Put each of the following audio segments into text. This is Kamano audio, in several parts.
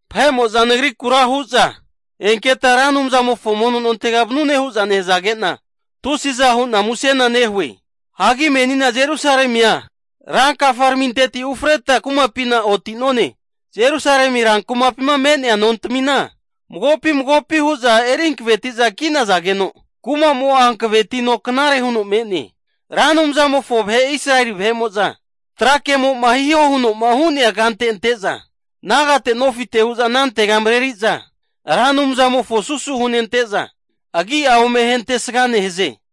Vahe'mo'za nagrikura hu'za, enketa Ra Anumzamofo mono nontegama vanune hu'za nehazage'na, tusiza hu'na musena nehue. Hagi menina Jerusalemia rankafaraminteti ufreta kumapina oti'none. Jerusalemi rankumapima me'nea nontamina magopi magopi hu'za eri hankaveti'za ki'nazageno, kuma'mo'a hankavetino knare huno me'ne. Ra Anumzamofo vahe Israeli vahe'mo'za trakemo'ma hihoma huno hu'nea kante ante'za, nagate nofite hu'za anantega mareri'za Ra Anumzamofona susu hunente'za, agi ome ahentesga nehaze.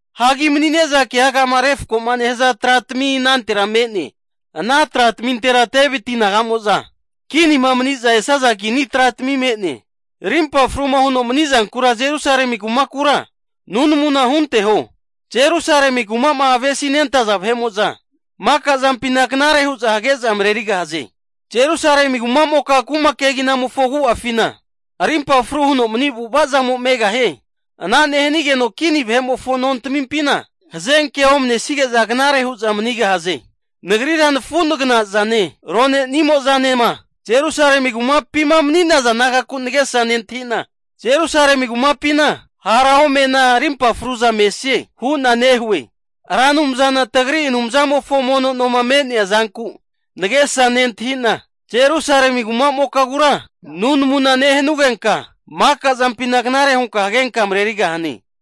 Hagi mani'neza keagama refko'ma nehaza tratami anantera me'ne. Ana tratamintera Deviti naga'mo'za kinima mani'za esaza kini tratami me'ne. Rimpa fruma huno manizankura Jerusalemi rankumakura nunamu hunteho. Jerusalemi kuma'ma avesi nentaza vahe'mo'za makazampina knare hu'za hage'za marerigahaze! Jerusalemi kuma'moka kuma keginamofo agu'afina arimpa fru huno mani avu'ava zamo megahie. Ana nehanigeno kini vahe'mofo nontamimpina hazenkea omanesige'za knare hu'za manigahaze. Nagrira nafu nagna'zane, rone'nimo'zanema Jerusalemi kumapima mani'naza nagaku nagesa nentahi'na, Jerusalemi kumapina hara omena arimpa fru'za mesanie hu'na nehue. Ra Anumzana tagri Anumzamofo mono noma me'nea zanku nagesa nentahi'na, Jerusalemi kuma'mokagura nunamuna nehanugenka maka zampina knare hunka hagenka marerigahane.